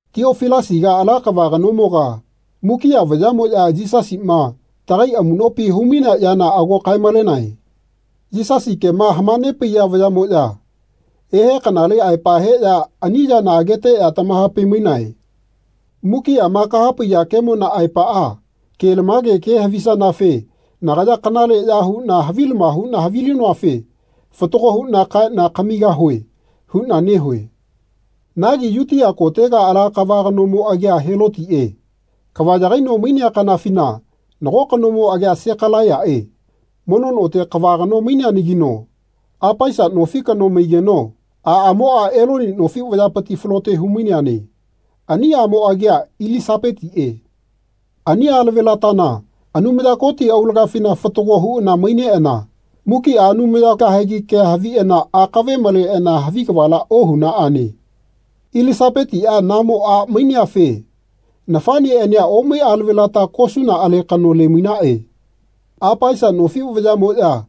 Tiofilasiga ala kava kanomoga mukiꞌa vayaꞌmoꞌya Yisasiꞌma tagai amuꞌnopi humainea yana ago kaemalenae. Yisasi kema hamanepaiya vayaꞌmoꞌya ehe kanale aepa heꞌya ani yana ageteꞌya tamahapaimainae. Mukiꞌama kahapaiya kemona aepaꞌa kelamake ke havisa-nafe nagaya kanaleꞌya huꞌna havilama huꞌna havilinoafe fatago huꞌna kaeꞌna kamigahue huꞌna nehue. Nagi Yutia kotega ala kava kanomo agia Helotiꞌe kava yagaino mainea kanafina nago kanomo agia Sekalaiyaꞌe mono note kava kano maineanagino Apaisa nofi kano mai-geno aꞌamoꞌa Eloni nofi vayapiti falote humaineane. Ani aꞌmo agia Ilisapetiꞌe. Ani alavelatana Anumaya Koti aulagafina fatago huꞌana mai-neꞌana mukiꞌa Anumayamo kahegi kea haviꞌana akave maleꞌana havi kavala ohunaꞌane. Ilisapetiꞌa namo a maineafe nafaꞌneꞌania omai alavelata kosuna alekano lemainaꞌe. Apaisa nofi vayaꞌmoꞌya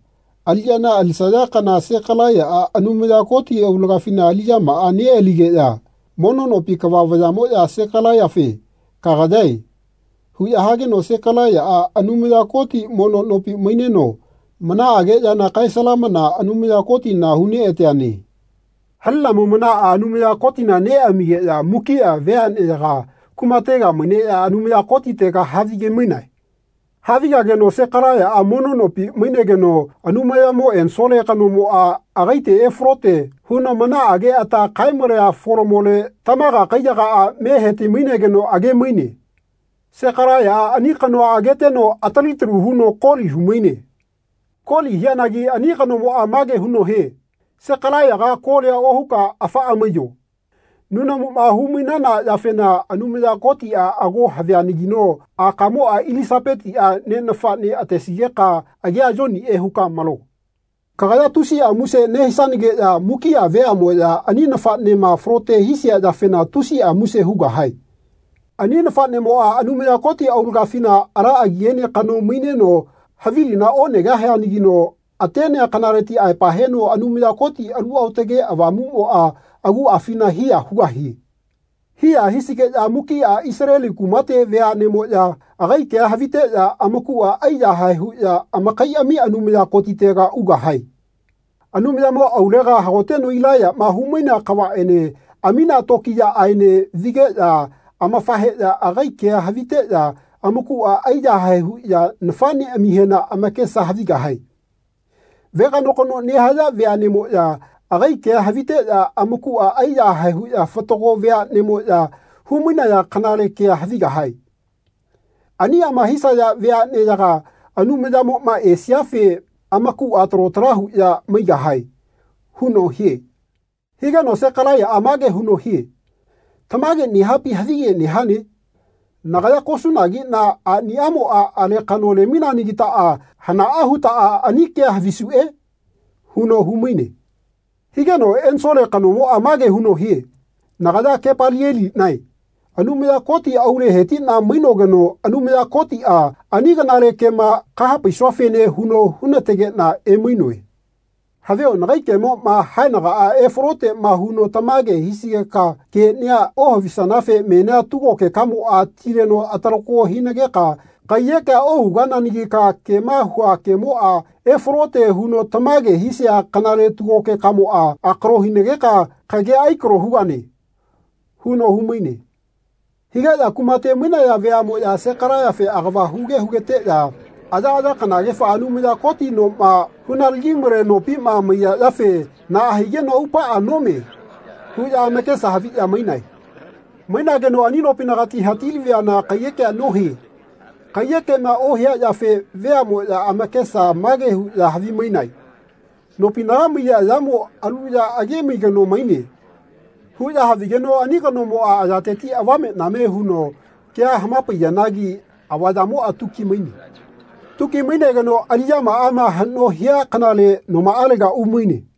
aliꞌya alisaya kana Sekalaiyaꞌa Anumaya Koti aulagafi aliꞌyamaꞌa neꞌaligeꞌya mono nopi kava vayaꞌmoꞌya Sekalaiyafe “Kagayae.” huꞌya hageno Sekalaiyaꞌa Anumaya Koti mono nopi maineno manaꞌage yana kaesalamana Anumaya Kotina huneꞌateane. Halinamo manaꞌa Anumaya Kotina neꞌamigeꞌya mukiꞌa veaꞌne-yaga kumatega maineꞌya Anumaya Kotitega havigemainae. Havigageno Sekalaiyaꞌa mono nopi mainegeno Anumayamo ensole kanomoꞌa agaite efalote huno manaꞌage ata kaemalea folamole tamaga kaiyagaꞌa me hetimainegeno agemaine. Sekalaiyaꞌa ani kanoa ageteno atali talu huno koli humaine. Koli hianagi ani kanomoꞌa mage huno hie “Sekalaiyaga kolia ohuka afaꞌa maiyo. Nunamuma humainana yafena Anumaya Kotiꞌa ago havianagino akamoꞌa Ilisapetiꞌa ne nafaꞌne atesigeka agia Yoniꞌe huka malo. Kagaya tusiꞌa muse nehisanageꞌya mukiꞌa veaꞌmoꞌya ani nafaꞌnema falote hisia yafena tusiꞌa muse hugahae. Ani nafaꞌnemoꞌa Anumaya Koti aulagafina ala agiene kano maineno havilina onegahia-nagino atenea kanaleti aepa heno Anumaya Koti Alu Aotage Avamuꞌmoꞌa aguꞌafina hiya hugahie. Hiya hisigeno mukiꞌa Isaleli kumate veaꞌnemoꞌya agai kea haviteꞌya amakuꞌa aiyahae huꞌya amakaiꞌami Anumaya Kotitega ugahae. Anumayamo aulega hagoteno Ilaiyaꞌma humainea kavaꞌene aminea tokiꞌyaꞌaene vigeꞌya amafaheꞌya agai kea haviteꞌya amakuꞌa aiyahae huꞌya nafaꞌneꞌamihena amakesa havigahae. Veganokano nehaya veaꞌneꞌmoꞌya agai kea haviteꞌya amakuꞌa aiyahae huꞌya fatago veaꞌneꞌmoꞌya humainaya kanale kea havigahae. Aniꞌama hisayafe veaꞌneyaga Anumayamoꞌma esiafe amakuꞌa talo tala huꞌya maigahae.” huno hie. Higeno Sekalaiyaꞌa mage huno hie “Tamage nehapi havige nehane? Nagaya kosunagiꞌna aꞌnimoꞌa alekano lemaineanagitaꞌa hanaꞌa hutaꞌa ani kea havisuꞌe?” huno humaine. Higeno ensole kanomoꞌa mage huno hie “Nagaya Kepalieliꞌnae Anumaya Koti aule hetiꞌna mainogeno Anumaya Kotiꞌa ani kanale kema kahapaisuafene huno hunategeꞌna emainoe. Havio nagai kemoꞌma haenagaꞌa efaloteꞌma huno tamage hisigeka keꞌnia ohavinanafe menia tugogekamoꞌa tileno atalako hinageka kaiyekea ohugananagika kema hua kemoꞌa efalote huno tamage hisia kanale tugogekamoꞌa akalo hinageka kagea aikalo hugane.” huno humaine. Higeꞌya kumate mainaya veaꞌmoꞌya Sekalaiyafe agava huge hugeteꞌya ayaꞌaya kanagefa Anumaya Koti noma hunalagimale nopima maiya yafe “Naꞌa higeno aupaꞌa nome.” huꞌya amakesa haviꞌya mainae. Mainageno ani nopinagati hatilaviana kaiyekea nohie. Kaiyekema ohia yafe veaꞌmoꞌya amakesa mage huꞌya havimainae “Nopinaga maiya yamo alu ya agemai kano maine.” huꞌya havigeno ani kanomoꞌa ayateti avameꞌname huno kea hamapaiya-nagi avayamoꞌa tuki maine. Tuki mainegeno aliꞌyamaꞌama haꞌno hia kanale nomaꞌalega umaine.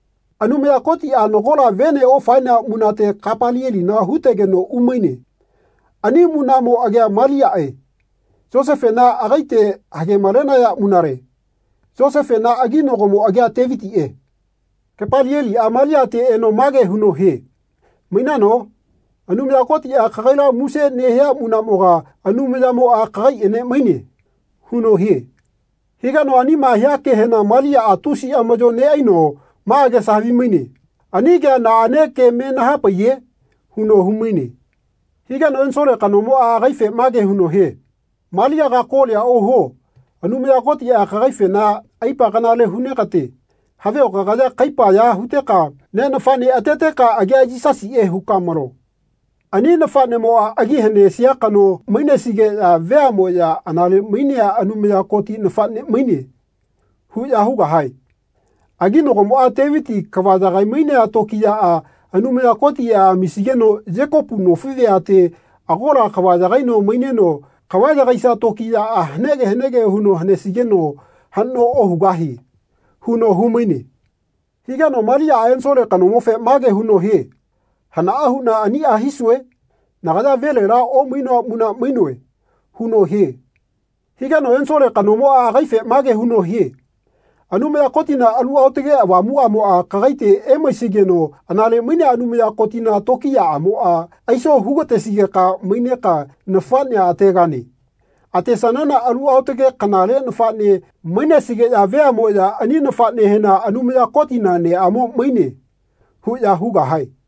Anumaya Kotiꞌa nagola vene ofaenea munate Kepalielina hutegeno umaine. Ani munaꞌmo agia Maliaꞌe. Yosefena agaite hagemalenaya munale. Yosefena aginagomo agia Tevitiꞌe. Kepalieliꞌa Maliate eno mage huno hie “Mainano? Anumaya Kotiꞌa kagaila muse nehia munaꞌmoga Anumayamoꞌa kagaiꞌene maine.” huno hie. Higeno anima hia kehena Maliaꞌa tusi amaꞌyo neꞌaino ma agesa havimaine “Ani kea naꞌane ke me nahapaiye?” huno humaine. Higeno ensole kanomoꞌa agaife mage huno hie “Maliaga kolia ohuo. Anumaya Kotiꞌa kagaifena aipa kanale hunegate Havio kagaya kaipa ya huteka ne nafaꞌne ateteka agia Yisasiꞌe huka malo. Ani nafaꞌnemoꞌa agi hanesia kano mainesigeꞌya veaꞌmoꞌya ‘Anale mainea Anumaya Koti nafaꞌne maine.’ huꞌya hugahae. Aginagomoꞌa, Teviti kava yagaimainea tokiyaꞌa Anumaya Kotiꞌa amisigeno Yekopu nofi veate agola kava yagaino maineno kava yagaisia tokiyaꞌa hanege hanege huno hanesigeno haꞌno ohugahie.” huno humaine. Higeno Maliaꞌa ensole kanomofe mage huno hie “Hanaꞌa huꞌna aniꞌa hisue? Nagaya velela omainoa muna mainoe.” huno hie. Higeno ensole kanomoꞌa agaife mage huno hie “Anumaya Kotina Alu Aotage Avamuꞌamoꞌa kagaite emaisigeno anale mainea Anumaya Kotina tokiyaꞌamoꞌa aiso hugatesigeka maineka nafaꞌnea ategane. Atesanana alu aotage kanale nafaꞌne mainesigeꞌya veaꞌmoꞌya ani nafaꞌnehena ‘Anumaya Kotina neꞌamo maine.’ huꞌya hugahae.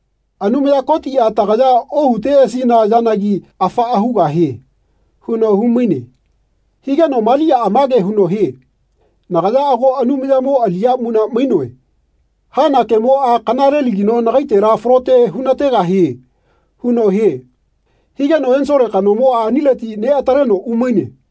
Anumaya Kotiꞌa tagaya ohuteꞌasina yanagi afaꞌa hugahie.” huno humaine. Higeno Maliaꞌa mage huno hie “Nagaya ago Anumayamo aliꞌya muna mainoe. Hana kemoꞌa kanalelagino nagaitela falote hunategahie.” huno hie. Higeno ensole kanomoꞌa anileti neꞌataleno umaine.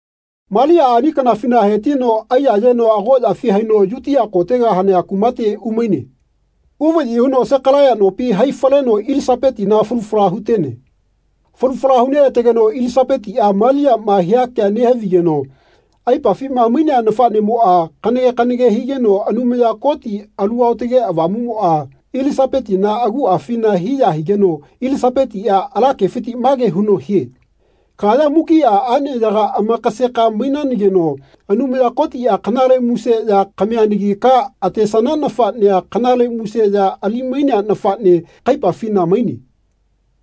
Maliaꞌa ani kanafina hetino aiyayeno agoꞌyafi haino Yutia kotega hanea kumate umaine. Uvayi huno Sekalaiya nopi hai faleno Ilisapetina falu fala hutene. Falu fala huneꞌategeno Ilisapetiꞌa Maliaꞌma hia kea nehavigeno aipafima mainea nafaꞌnemoꞌa kanage kanage higeno Anumaya Koti Alu Aotage Avamuꞌmoꞌa Ilisapetina aguꞌafina hiya higeno Ilisapetiꞌa ala kefiti mage huno hie “Kagaya mukiꞌa aꞌneyaga amakaseka mainanageno Anumaya Kotiꞌa kanale muse ya kamianagika atesana nafaꞌnea kanale muse ya alimainea nafaꞌne kaipafina maine.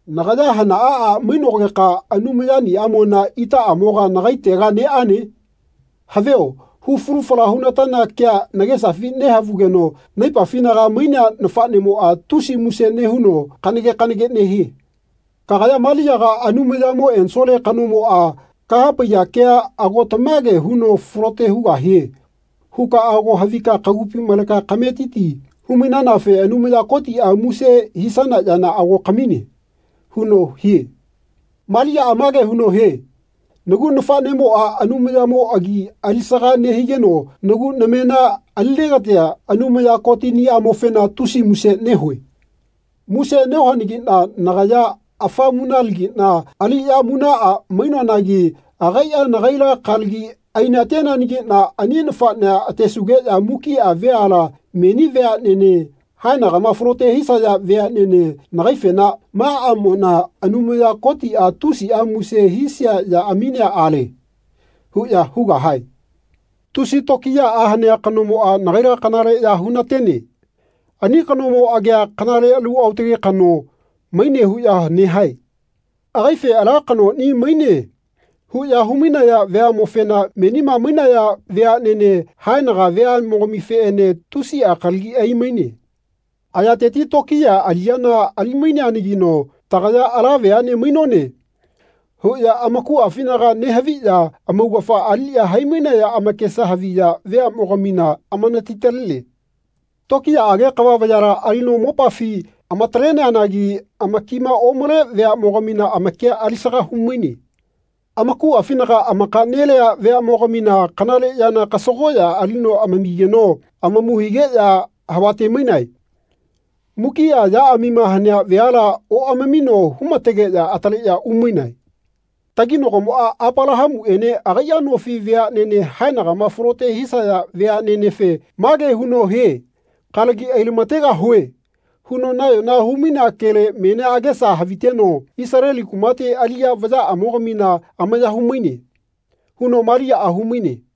Nagaya hanaꞌa a mainogeka Anumayaniꞌamona itaꞌamoga nagaitega neꞌane. Havio hu falu fala hunatana kea nagesafi nehavugeno naipafinaga mainea nafaꞌnemoꞌa tusi muse nehuno kanage kanage nehie. Kagaya Maliaga Anumayamo ensole kanomoꞌa kahapaiya kea ago tamage huno falote hugahie huka ago havika kagupi maleka kametiti humainanafe Anumaya Kotiꞌa muse hisana yana ago kamine.” huno hie. Maliaꞌa mage huno hie “Nagu nafaꞌnemoꞌa Anumayamo agi alisaga nehigeno nagu namena alinegatia Anumaya Kotiniꞌamofena tusi muse nehue. Muse nehuanagiꞌna nagaya afa munalagiꞌna aliꞌya munaꞌa mainoanagi agaiꞌa nagaila kalagi ainateanagiꞌna ani nafaꞌnea atesugeꞌya mukiꞌa veala meni veaꞌnene haenagama falote hisaya veaꞌnene nagaifena ‘Ma aꞌmona Anumaya Kotiꞌa tusiꞌa muse hisia ya aminea ale.’ huꞌya hugahae. Tusi tokiyaꞌa hanea kanomoꞌa nagaila kanale ya hunatene. Ani kanomo agia ‘Kanale alu aotage kano.’ maine huꞌya nehae. Agaife ‘Ala kanoꞌni maine.’ huꞌya humai-naya veaꞌmofena menima mainaya veaꞌnene haenaga veaꞌmogamifeꞌene tusiꞌa kalagi aimaine. Ayateti tokiya aliꞌyana alimaineanagino ‘Tagaya ala veaꞌne mainone.’ huꞌya amakuꞌafinaga nehaviꞌya amaugafa aliꞌya haimainaya amakesa haviya veaꞌmogamina amanatitalene. Tokiyaꞌage kava vayala alino mopafi amataleneanagi amakima omale veaꞌmogamina amakia alisaga humaine. Amakuꞌafinaga amakaꞌ-nelea veaꞌmogamina kanale yana kasagoꞌya alino amamigeno amamu higeꞌya havatemainae. Mukiꞌa yaꞌamima hanea veala oꞌamamino humategeꞌya ataleꞌya umainae. Taginagomoꞌa Apalahamuꞌene agaiꞌa nofi veaꞌnene haenagama falote hisaya veaꞌnenefe mage huno hie ‘Kalagi ailamategahue.’ huno nayona humainea kele menia agesa haviteno Isaleli kumate aliꞌya vayaꞌamogamina amaya humaine.” huno Maliaꞌa humaine.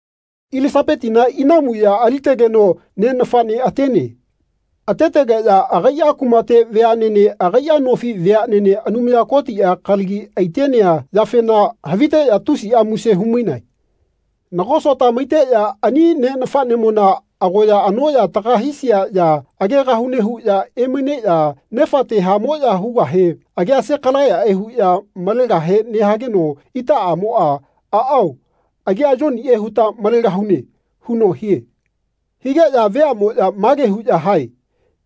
Ilisapetina inamu ya alitegeno ne nafaꞌne atene. Atetegeꞌya agaiꞌa kumate veaꞌnene agaiꞌa nofi veaꞌnene Anumaya Kotiꞌa kalagi aitenea yafena haviteꞌya tusiꞌa muse humainae. Nago sota maiteꞌya ani ne nafaꞌnemona agoya anoꞌya taga hisia ya agegahune huꞌya emaineꞌya nefate hamoꞌya hugahe agia Sekalaiyaꞌe huꞌya malegahe nehageno itaꞌamoꞌa “Aꞌao agia Yoniꞌe huta malegahune.” huno hie. Higeꞌya veaꞌmoꞌya mage huꞌya hae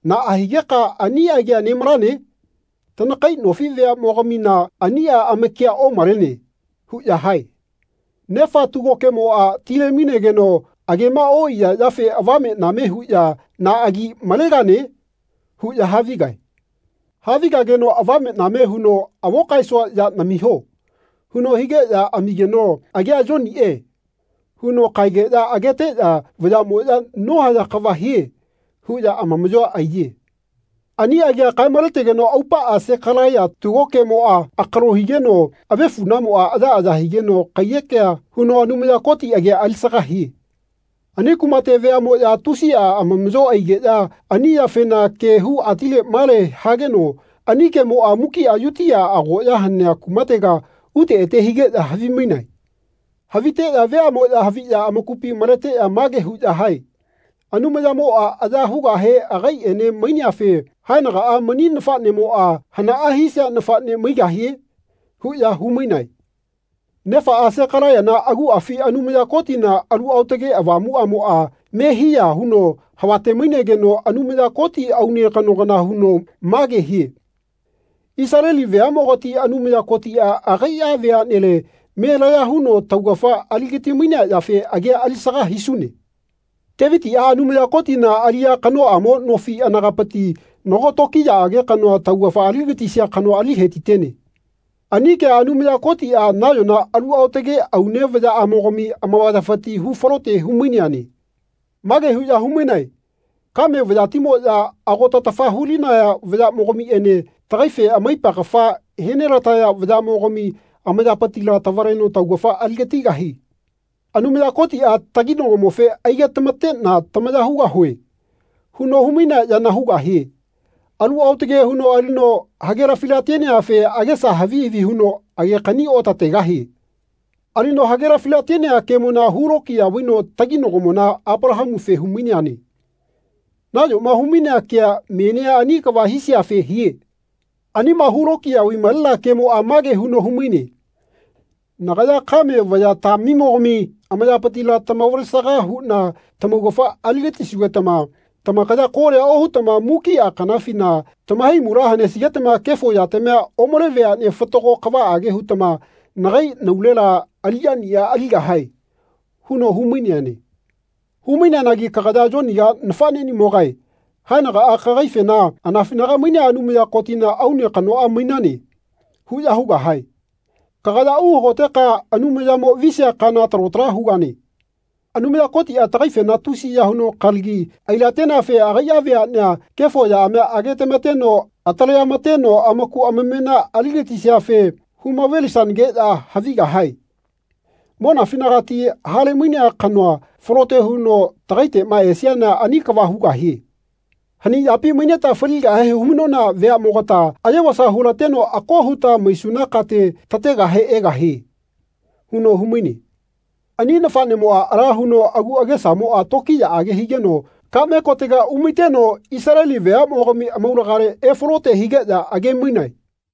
“Naꞌa higeka ani agia nemalane? Tanakai nofi veaꞌmoga-mina aniꞌa amakia omalene.” huꞌya hae. Nefa tugokemoꞌa tilemainegeno agema oꞌaiya yafe avameꞌname huꞌya “Na agi malegane?” huꞌya havigae. Havigageno avameꞌname huno “Avo kaesua ya namiho.” huno higeꞌya amigeno “Agia Yoniꞌe.” huno kaegeꞌya ageteꞌya vayaꞌmoꞌya “Nohaya kava hie.” huꞌya amamaꞌyoa aiye. Ani agia kaemaletegeno aupaꞌa Sekalaiya tugokemoꞌa akalo higeno avefuꞌnamoꞌa ayaꞌaya higeno kaiyekea huno Anumaya Koti agia alisaga hie. Ani kumate veaꞌmoꞌya tusiꞌa amamaꞌyo aigeꞌya ani yafena ke hu atile male hageno ani kemoꞌa mukiꞌa Yutia agoꞌya hanea kumatega ute ete higeꞌya havimainae. Haviteꞌya veaꞌmoꞌya haviꞌya amakupi maleteꞌya mage huꞌya hae “Anumayamoꞌa aya hugahe agaiꞌene maineafe haenagaꞌa mani nafaꞌnemoꞌa hanaꞌa hisia nafaꞌne maigahie?” huꞌya humainae. Nefaꞌa, Sekalaiyana aguꞌafi Anumaya Kotina Alu Aotage Avamuaꞌamoꞌa me hiya huno havatemainegeno Anumaya Koti aune kano kana huno mage hie “Isaleli veaꞌmogati Anumaya Kotiꞌa agaiꞌa veaꞌnele me laya huno taugafa aligatimainea yafe agia alisaga hisune. Tevitiꞌa Anumaya Kotina aliꞌya kanoꞌamo nofi anagapiti nago tokiyaꞌage kanoa taugafa aligatisia kano ali hetitene. Ani kea Anumaya Kotiꞌa nayona alu aotage aune vayaꞌamogami amavayafiti hu falote humaineane. Mage huꞌya humainae ‘Kame vayatimoꞌya ago tatafa hulinaya vayaꞌmogamiꞌene tagaife amaipa kafa henelataya vayaꞌmogami amayapitila tavaleno taugafa aligatigahie.’ Anumaya Kotiꞌa taginagomofe ‘Aigetamateꞌna tamaya hugahue.’ huno humainea yana hugahie. Alu aotage huno alino hagelafilateneafe agesa havi havi huno agekani otategahie. Alino hagelafilatenea kemona hulokiya vaino taginagomona Apalahamufe humaineane. Nayoma humainea kea menia ani kava hisiafe hie. Anima hulokiya vaimalenea kemoꞌa mage huno humaine ‘Nagaya kame vayatamimogami amayapitila tamavalesaga huꞌna tamaugafa aligatisugetama tamakaya kolia ohutama mukiꞌa kanafina tamahaimula hanesigetama kefo yatamia omale veaꞌnea fatago kavaꞌage hutama nagai naulela aliꞌyaniꞌa aligahae.’ huno humaineane. Humaineanagi kagaya Yoniga nafaꞌneꞌnimogae haenagaꞌa kagaifena ‘Anafinaga mainea Anumaya Kotina aune kanoꞌa mainane.’ huꞌya hugahae. Kagaya uhagoteka Anumayamo visia kana talo tala hugane. Anumaya Kotiꞌa tagaifena tusiya huno kalagi ailateneafe agaiꞌa veaꞌnea kefo yaꞌamia agetamateno ataleꞌamateno amaku amamena aligatisiafe humavelisanageꞌya havigahae. Monafinagati halemainea kanoa falote huno tagaiteꞌma esiana ani kava hugahie. Hani yapi maineta faligahe humainona veaꞌmogata ayevasa hulateno ako huta maisuna kate tategahe egahie.” huno humaine. Ani nafaꞌnemoꞌa ala huno agu agesamoꞌa tokiyaꞌage higeno kaꞌme kotega umaiteno Isaleli veaꞌmogami amaulagale efalote higeꞌya agemainae.